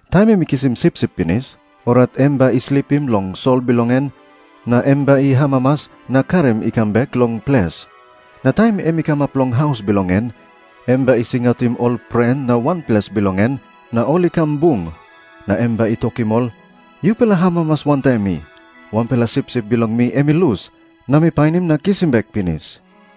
Taim em i kisim sipsip pinis, orait em bai i slipim long sol bilong en, na em bai i amamas na karim i kam bek long ples. Na taim em i kamap long haus bilong en, em bai i singautim ol pren na wanples bilong en, na ol i kam bung. Na em bai i tokim ol, 'Yupela amamas wantaim mi! Wanpela sipsip bilong mi em i lus, na mi painim na kisim bek pinis!'"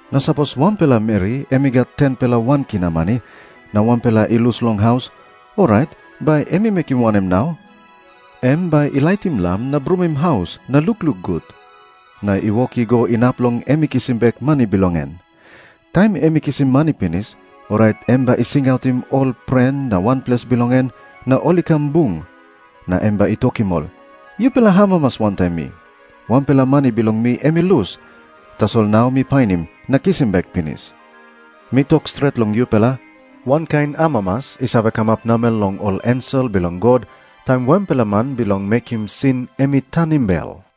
Na Jisas i tok moa olsem, "Na sapos wanpela meri em i gat 10-pela wan kina mani, na wanpela i lus long haus, orait bai em i mekim wanem nau? Em bai i laitim lam na brumim haus na lukluk gut, na i wok i go inap long em i kisim bek mani bilong en. Taim em i kisim mani pinis, orait em bai i singautim ol pren na wanples bilong en, na ol i kam bung. Na em bai i tokim ol, 'Yupela amamas wantaim mi! Wanpela mani bilong mi em i lus, tasol nau mi painim na kisim bek pinis!'" Na Jisas i tok olsem, "Mi tok stret long yupela, wankain amamas i save kamap namel long ol ensel bilong God taim wanpela man bilong mekim sin em i tanim bel."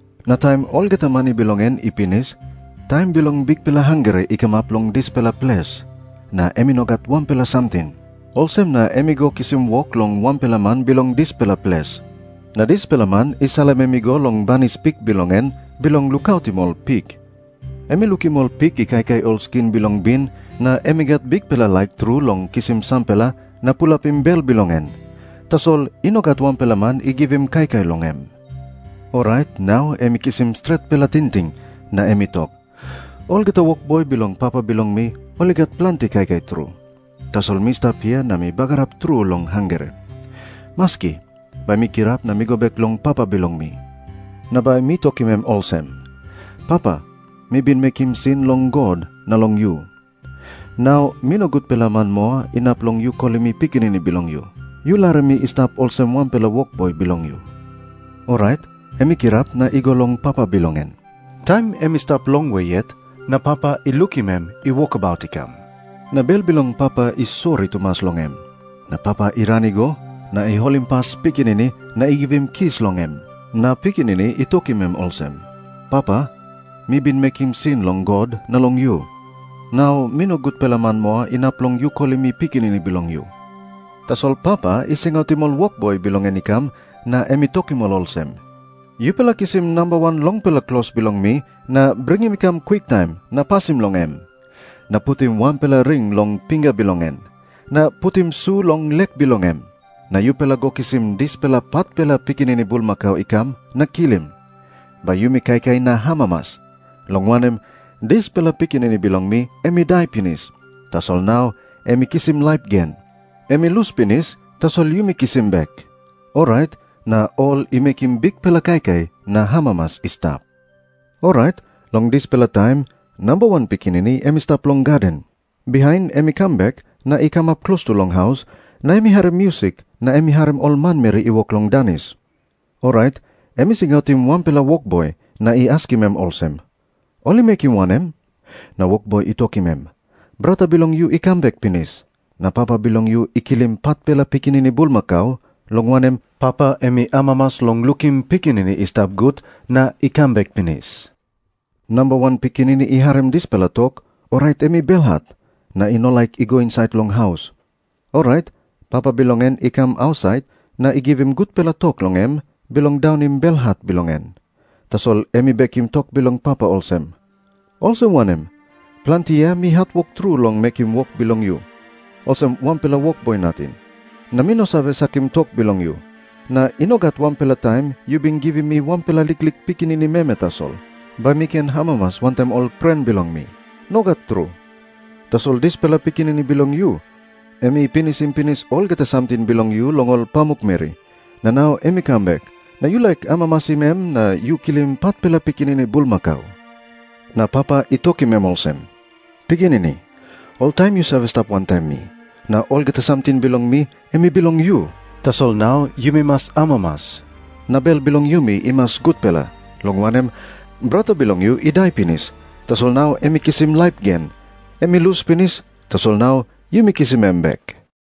Na taim olgeta mani bilong en i pinis, taim bilong bikpela hangre i kamap long dispela ples. Na em i no gat wanpela samting. Olsem na em i go kisim wok long wanpela man bilong dispela ples. Na dispela man i salim em i go long banis pik bilong en bilong lukautim ol pik. Em i lukim ol pik i kaikai ol skin bilong bin, na em i gat bikpela laik tru long kisim sampela na pulapim bel bilong en. Tasol i no gat wanpela man i givim kaikai long em. "Orait nau em i kisim stretpela tingting, na em i tok, 'Olgeta wokboi bilong papa bilong mi ol i gat planti kaikai tru. Tasol mi stap hia na mi bagarap tru long hangre. Maski, bai mi kirap na mi go bek long papa bilong mi. Na bai mi tokim em olsem, "Papa, mi bin mekim sin long God na long yu. Nau mi no gutpela man moa inap long yu kolim mi pikinini bilong yu. Yu larim mi i stap olsem wanpela wokboi bilong yu.'" Orait em i kirap na i go long papa bilong en. Taim em i stap long we yet na papa i lukim em i wokabut i kam. Na bel bilong papa i sori tumas long em. Na papa i ran i go, na i holimpas pikinini na i givim kis long em. Na pikinini i tokim em olsem, 'Papa, mi bin mekim sin long God na long yu. Nau mi no gutpela man moa inap long yu kolim mi pikinini bilong yu.' Tasol papa i singautim ol wokboi bilong en i kam na em i tokim ol olsem, 'Yupela kisim namba wan longpela klos bilong mi na bringim i kam kwiktaim na pasim long em. Na putim wanpela ring long pinga bilong em. Na putim su long lek bilong em. Na yupela go kisim dispela patpela pikinini bulmakau i kam na kilim. Bai yumi kaikai na amamas. Long wanem, dispela pikinini bilong mi em i dai pinis, tasol nau em i kisim laip gen. Em i lus pinis, tasol yumi kisim bek.' Orait na ol i mekim bikpela kaikai na amamas i stap. "Orait long dispela taim namba wan pikinini em i stap long gaden. Bihain em i kam bek, na i kamap klostu long haus, na em i harim musik na em i harim ol manmeri i wok long danis. Orait em i singautim wanpela wokboi, na i askim em olsem, 'Ol i mekim wanem?' Na wokboi i tokim em, 'Brata bilong yu i kam bek pinis, na papa bilong yu i kilim patpela pikinini bulmakau, long wanem, papa em i amamas long lukim pikinini i stap gut na i kam bek pinis.' Namba wan pikinini i harim dispela tok, orait em i belhat, na i no laik i go insait long haus. Orait papa bilong en i kam ausait na i givim gutpela tok long em bilong daunim belhat bilong en. Tasol em i bekim tok bilong papa olsem, 'Olsem wanem? Planti yia mi hatwok tru long mekim wok bilong yu, olsem wanpela wokboi nating. Na mi no save sakim tok bilong yu. Na i no gat wanpela taim yu bin givim mi wanpela liklik pikinini meme tasol, bai mi ken amamas wantaim ol pren bilong mi. Nogat tru. Tasol dispela pikinini bilong yu, em i pinisim pinis olgeta samting bilong yu long ol pamukmeri. Na nau em i kam bek, na yu laik amamasim em na yu kilim patpela pikinini bulmakau.' "Na papa i tokim em olsem, 'Pikinini, oltaim yu save stap wantaim mi. Na olgeta samting bilong mi em i bilong yu. Tasol nau yumi mas amamas, na bel bilong yumi i mas gutpela, long wanem, brata bilong yu i dai pinis, tasol nau em i kisim laip gen. Em i lus pinis, tasol nau yumi kisim em bek.' "